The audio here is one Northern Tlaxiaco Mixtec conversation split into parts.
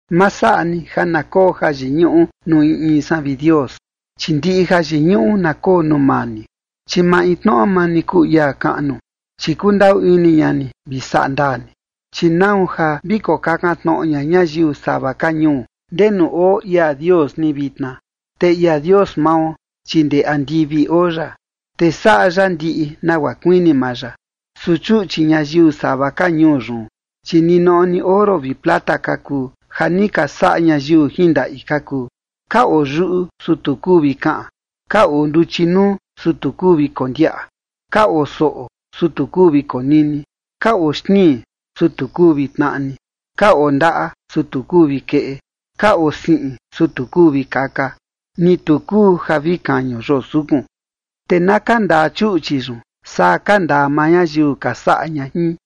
Ma saꞌa ni ja na koo jayiñuꞌu nuu in in san, vi Dios, chi ndiꞌi jayiñuꞌu na koo nuu maa ni, chi maintnoꞌo maa ni kuu ia kaꞌnu, chi kundaꞌu ini ña ni vi saꞌa ndaa ni. Chi ¿nau ja vi kokakan tnoꞌo ña ñayiu sava ka ñuu ndenu oo ia Dios ni vitna? Te ia Dios mao, chi ndee andivi oo ya, te saꞌa ya ndiꞌi nagua kuini maa ya. Su chuꞌchi ñayiu sava ka ñuu yun, chi ninoꞌo ni oro vi plata ka kuu, ja ni ka saꞌa ñayiu jin ndaꞌi ka kuu. Ka oo yuꞌu, su tu kuu vi kaꞌan, ka oo nduchi nuu, su tu kuu vi kondiaꞌa. Ka oo soꞌo, su tu kuu vi konini, ka oo xtnii, su tu kuu vi tnaꞌni. Ka oo ndaꞌa, su tu kuu vi keꞌe, ka oo siꞌin, su tu kuu vi kaka, ni tu kuu ja vi kañu yoo sukun. Te na kandaa chuꞌchi yun saa kandaa maa ñayiu ka saꞌa ña jin,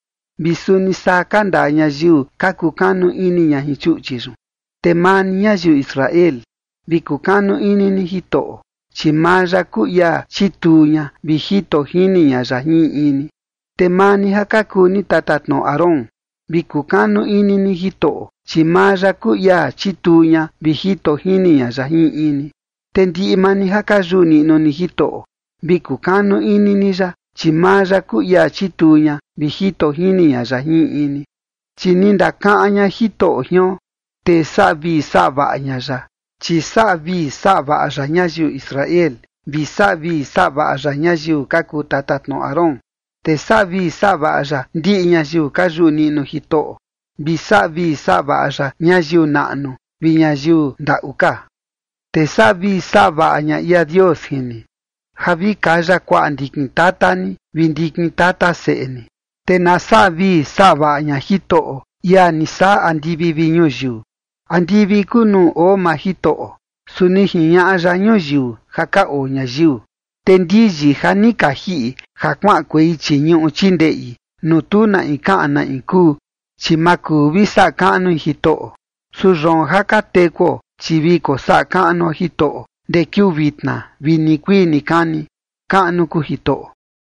vi suni saa kandaa ñayiu ka kukanu ini ña jin chuꞌchi yun. Te maa ni, ñayiu Israel, vi kukanu ini ni Jitoꞌo, chi maa ya kuu ia chituu ña vi jito jini ña ya jin in in ni. Te maa ni ja ka kuu ni tatatnoꞌo Aarón, vi kukanu ini ni Jitoꞌo, chi maa ya kuu ia chituu ña vi jito jini ña ya jin in in ni. Te ndiꞌi maa ni ja ka yuꞌu niꞌnu ni Jitoꞌo, vi kukanu ini ni ya, chi maa ya kuu ia chituu ña vi jito jini ña ya jin in in ni. Chi ni ndakaꞌan ña Jitoꞌo jion, te saꞌa vii saꞌa vaꞌa ña ya, chi saꞌa vii saꞌa vaꞌa ya ñayiu Israel, vi saꞌa vii saꞌa vaꞌa ya ñayiu ka kuu tatatnoꞌo Aarón. Te saꞌa vii saꞌa vaꞌa ya ndiꞌi ñayiu ka yuꞌu niꞌnu Jitoꞌo, vi saꞌa vii saꞌa vaꞌa ya ñayiu naꞌnu ka vi ñayiu ndaꞌu ka. Te saꞌa vii saꞌa vaꞌa ña ia Dios jin ni, ja vi kaya kuaꞌa ndikin tata ni vi ndikin tata seꞌe ni. Te na saꞌa vii saꞌa vaꞌa ña Jitoꞌo, ia ni saꞌa andivi vi ñuyiu. Andivi kuu nuu oo maa Jitoꞌo, su ni jiñaꞌa ya ñuyiu ja ka oo ñayiu. Te ndiyi ja ni ka jiꞌi ja kuaꞌankuei chii ñuꞌu chii ndeꞌi nuu tu na in kaꞌan na in kuu, chi ma kuu vi saꞌa kaꞌnui Jitoꞌo. Su yoon ja ka tekuo, chi vi kosaꞌa kaꞌnuo Jitoꞌo ndee kiuu vitna vi nikuii nikani. ¡Kaꞌnu kuu Jitoꞌo!